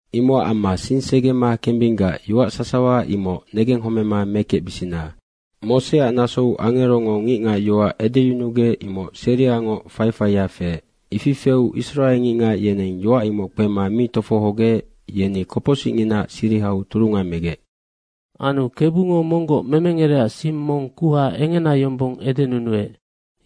Imocac amma sing segema kembinggac yoac sasawa imoc negenghomema mekecbisina. Moseac nasou angerongo ngicngac yoac edeyunugec, imoc seriangoc faifaia feec. Ifi feu Israe ngicngac yeneng yoac imoc kpema mi tofohogec, yeni kopocsicnginaac sirihau turunga megec. Anu Kebungo monggoc memengerecac sing mong kuha engena yombong edenunuec.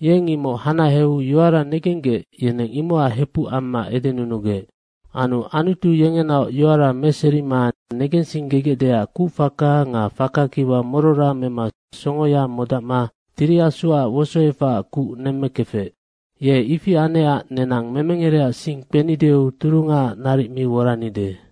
Yeng imoc hanaheu yoara negenggec yeneng imocac hepuc amma edenunugec. Anu Anutu yengenaoc yoara meserima negensinggegecdeac kucfaka nga faka kiwa morora mema songoya modacma Tiri Asuac wosoefacac kuc nemmekefec. Ye ifi anecac nenang memengerecac sing kpenideu turungaac naric mi woranide.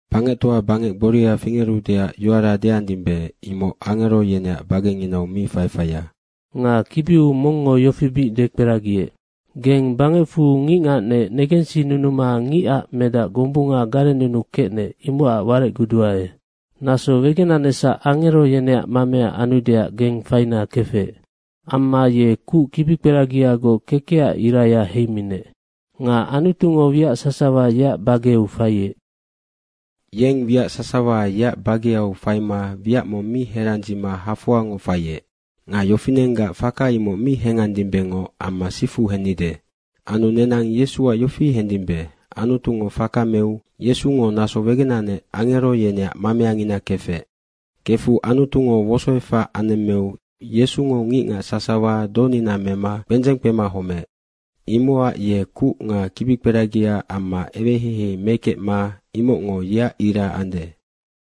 Bangectoa bangec gboria fingerudeac yoara deandimbe, imoc angero yeneac bagenginau mi faifaia. Nga kibiu mongngo yofi bic dekperagiec, “Geng bangecfu ngicngacnec negensinunuma ngicac medac gombunga garennunukecnec, imocac warecguduae. Naso wegenanecsac angero yeneac mamea anudeac geng faina kefec. Amma ye kuc kibikperagiagoc kekecac iraya heiminec. Nga Anutungo wiac sasawa yeac bageu faiec.” Yeng wiac sasawa yeac bageau faima wiac mong mi herandzima hafoangoc faiec. Nga yofinenggac faka imoc mi hengandimbengoc amma sifu hennide. Anu nenang Yesuac yofi hendimbe, Anutungo faka meu Yesungo naso wegenanec angero yeneac mameangina kefec. Kefu Anutungo wosoefac anemmeu Yesungo ngicngac sasawa donina mema kpendzeng kpema homeec. Imocac ye kuc nga kibikperagia amma eweheihei mekecma imocngo yeac ira ande.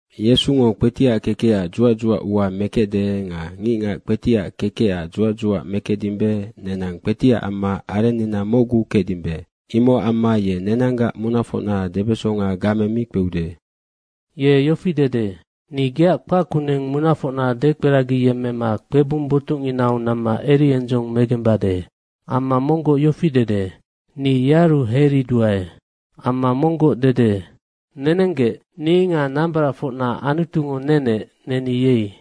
Yesungo kpetiac kekecac dzuac dzuac ua mekecde nga ngicngac kpetiac kekecac dzuac dzuac mekecdimbe, nenang kpetiac amma arennina mocgu kecdimbe. Imocac amma ye nenanggac munafocna debesonga game mi kpeude. Ye yofi dede, “Ni geac kpac kuneng munafocna dekperagiyemmema kpebung botucnginau namma eriendzong megembade.” Amma monggoc yofi dede, “Ni yearu heiriduae.” Amma monggoc dede, “Nenenggec, ni nga nambaracfocna Anutungo nenec, neni yei.”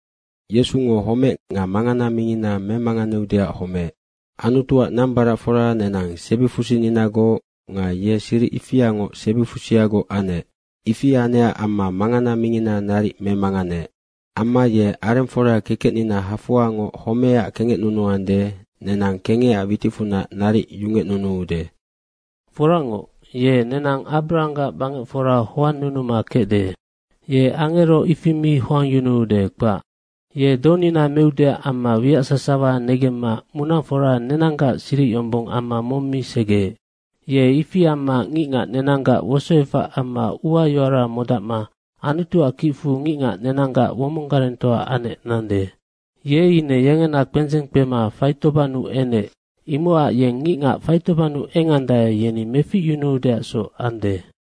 Yesungo homec nga mangana mingina memanganeudeac homeec. Anutuac nambaracfora nenang sebifusininagoc nga ye siric ifiangoc sebifusiagoc anec, ifi anecac amma mangana mingina naric memanganeec. Amma ye arengfora kekecnina hafoangoc homecac kengecnunuande, nenang kengecac witicfunac naric yungecnunuude. Foracngoc, ye nenang Abrahanggac bangecfora hoannunuma kecde. Ye angero ifi mi hoangyunude, kpac. Ye donina meudeac amma wiac sasawa negemma munafora nenanggac siric yombong amma mong mi segeec. Ye ifi amma ngicngac nenanggac wosoefac amma uayoara modacma Anutuac kicfu ngicngac nenanggac womonggarengtoa anec nande. Ye ine yengena kpendzeng kpema faitobannu enec, imocac yeng ngicngac faitobannu engandae, yeni meficyunuudeacsoc ande.